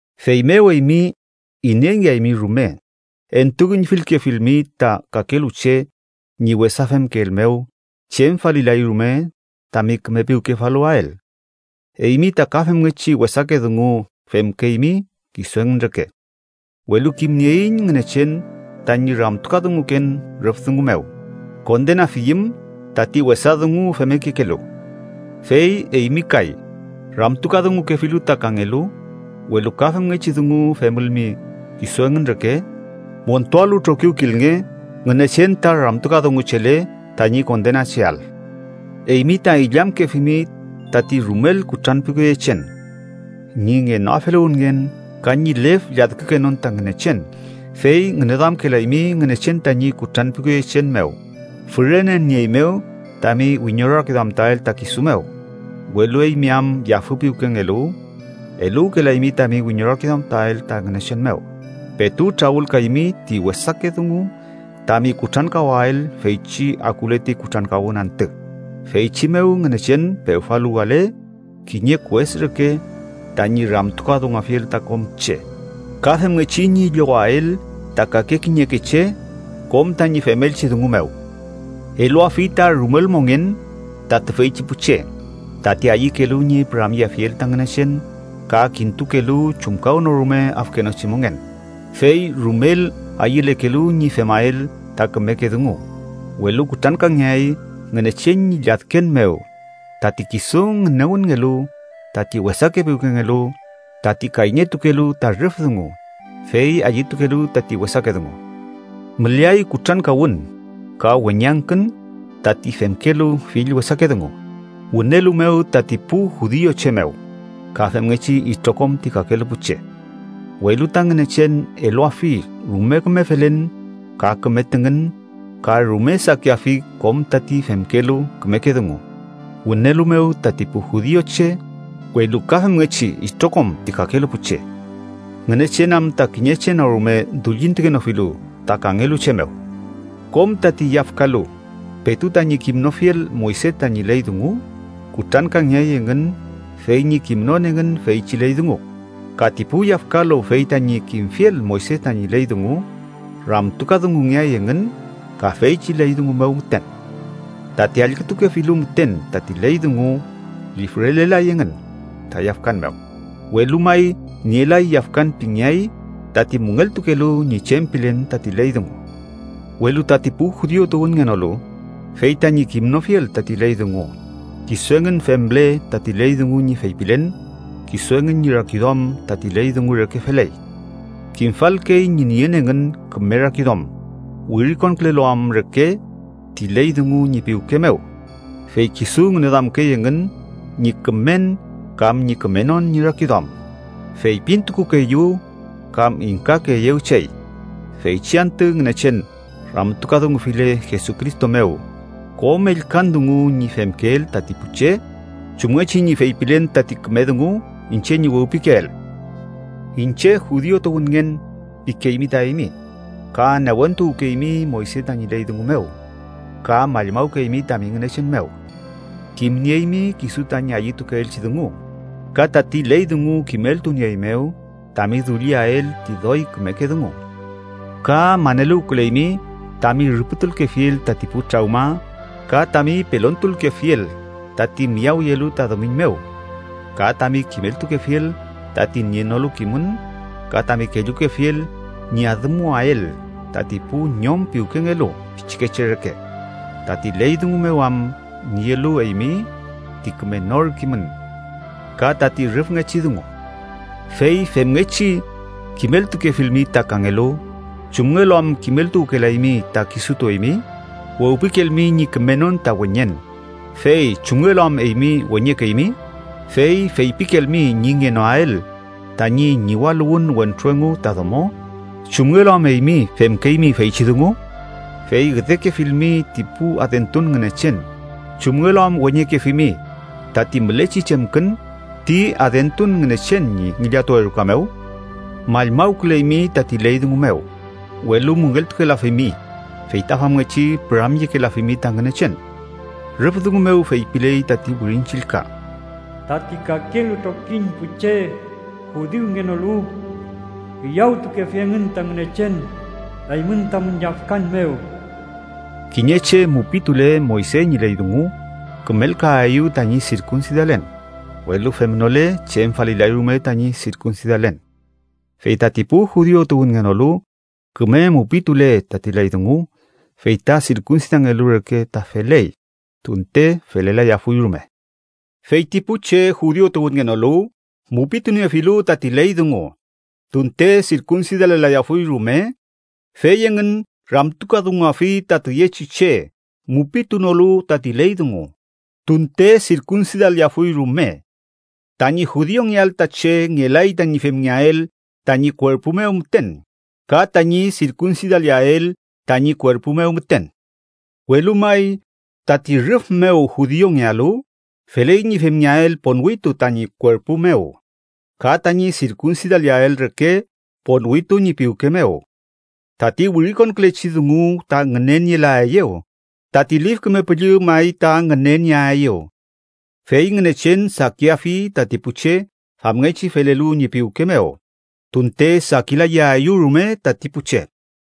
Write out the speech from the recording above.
Feymew eymi, ineyngeaymi rume, entuüñfilkefilmi ta kakelu che ñi wesa femkeel mew, chem falilay rume tami küme piwkefaluwael. Eymi ta ka femngechi wesake dungu femkeymi kisu engün reke. Welu kimnieiñ Ngünechen tañi ramtukadunguken rüf dungu mew kondenafiyüm tati wesa dungu femmekekelu. Fey eymi kay, ramtukadungukefilu ta kangelu, welu ka femngechi dungu femülmi kisu engün reke, montualu trokiwkilnge Ngünechen ta ramtukadunguchele tañi kondenacheael. Eymi ta illamkefimi tati rumel kutranpiwkeyechen, ñi ngenoafeluwünngen ka ñi lef lladkükenon ta Ngünechen. Fey ngüneduamkelaymi Ngünechen tañi kutranpiwkeyechen mew fürenenieeymew tami wiñorakiduamtuael ta kisu mew. Welu eymi am yafü piwkengelu, eluwkelaymi tami wiñorakiduamtuael ta Ngünechen mew, petu trawülkaymi ti wesake dungu tami kutrankawael feychi akule ti kutrankawün antü, feychi mew Ngünechen pewfaluwale kiñe kues reke tañi ramtukadunguafiel ta kom che, ka femngechi ñi llowael ta kake kiñeke che kom tañi femelchi dungu mew. Eluafi ta rumel mongen ta tüfeychi pu che, tati ayükelu ñi püramyeafiel ta Ngünechen ka kintukelu chumkawnorume afkenochi mongen, fey rumel ayülekelu ñi femael ta kümeke dungu, welu kutrankangeay Ngünechen ñi lladken mew tati kisu ngünewünngelu tati wesake piwkengelu, tati kayñeltukelu ta rüf dungu, fey ayütukelu tati wesake dungu. Müleay kutrankawün ka weñangkün tati femkelu fill wesake dungu, wünelu mew tati pu judiuche mew, ka femngechi itrokom ti kakelu pu che. Welu ta Ngünechen eluafi rume küme felen ka küme tüngün ka rume sakiafi kom tati femkelu kümeke dungu, wünelu mew tati pu judiuche, welu ka femngechi itrokom ti kakelu pu che. Ngünechen am ta kiñe che no rume dullintukenofilu ta kangelu che mew. Kom tati yafkalu petu tañi kimnofiel Moyse tañi ley dungu, kutrankangeay engün fey ñi kimnon engün feychi ley dungu, ka ti pu yafkalu fey tañi kimfiel Moyse tañi ley dungu, ramtukadungungeay engün ka feychi ley dungu mew müten. Tati allkütukefilu müten tati ley dungu lifrelelay engün ta yafkan mew, welu may nielay yafkan pingeay tati müngeltukelu ñi chem pilen tati ley dungu. Welu tati pu judiu tuwünngenolu, fey tañi kimnofiel tati ley dungu, kisu engün femle tati ley dungu ñi feypilen, kisu engün ñi rakiduam tati ley dungu reke feley. Kimfalkey ñi nien engün küme rakiduam, wirikonkülelu am reke ti ley dungu ñi piwke mew, fey kisu ngüneduamkey engün ñi kümen kam ñi kümenon ñi rakiduam, feypintukukeeyew kam ingkayaeyew chey feychi antü Ngünechen ramtukadungufile Jesucristo mew kom ellkan dungu ñi femkeel tati pu che, chumngechi ñi feypilen tati küme dungu iñche ñi wewpikeel. “Iñche judiu tuwünngen” pikeymi ta eymi, ka newentuwkeymi Moyse tañi ley dungu mew, ka mallmawkeymi tami Ngünechen mew. Kimnieymi kisu tañi ayütukeelchi dungu, ka tati ley dungu kimeltunieeymew tami dulliael ti doy kümeke dungu. Ka maneluwküleymi tami rüpütulkefiel tati pu trawma, ka tami pelontulkefiel tati miyawyelu ta dumiñ mew; ka tami kimeltukefiel tati nienolu kimün ka tami kellukefiel ñi adümuwael tati pu ñom piwkengelu pichikeche reke, tati ley dungu mew am nielu eymi ti küme nor kimün ka tati rüfngechi dungu. Fey femngechi, kimeltukefilmi ta kangelu, ¿chumngelu am kimeltuwkelaymi ta kisutu eymi? Wewpikelmi ñi kümenon ta weñen, ¿fey chumngelu am eymi weñekeymi? Fey feypikelmi ñi ngenoael tañi ñiwaluwün wentru engu ta domo, ¿chumngelu am eymi femkeymi feychi dungu? Fey üdekefilmi ti pu adentun ngünechen, ¿chumngelu am weñekefimi tati mülechi chemkün ti adentun ngünechen ñi ngillatuwe ruka mew? Mallmawküleymi tati ley dungu mew, welu müngeltukelafimi, fey ta famngechi püramyekelafimi ta Ngünechen. Rüf dungu mew feypiley tati Wirin Chillka: “Tati kakelu trokiñ pu che judiungenolu üyawtukefi engün ta Ngünechen eymün tamün yafkan mew.” Kiñe che mupitule Moyse ñi ley dungu, kümelkaeyew tañi sirkunsidalen, welu femnole chem falilay rume tañi sirkunsidalen. Fey tati pu judiu tuwünngenolu küme mupitule tati ley dungu, fey ta sirkunsidangelu reke ta feley, tunte felelayafuy rume. Fey ti pu che judiu tuwünngenolu mupituniefilu tati ley dungu, tunte sirkunsidalelayafuy rume, fey engün ramtukadunguafi ta tüyechi che mupitunolu tati ley dungu, tunte sirkunsidaleafuy rume. Tañi judiungeael ta che ngelay tañi femngeael tañi kuerpu mew müten, ka tañi sirkunsidaleael tañi kuerpu mew müten, welu may tati rüf mew judiungealu, feley ñi femngeael ponwitu tañi kuerpu mew, ka tañi sirkunsidaleael reke ponwitu ñi piwke mew. Tati wirikonkülechi dungu ta ngünenielaeyew, tati Lif Küme Püllü may ta ngünenieaeyew. Fey Ngünechen sakiafi tati pu che famngechi felelu ñi piwke mew, tunte sakilayaeyew rume tati pu che.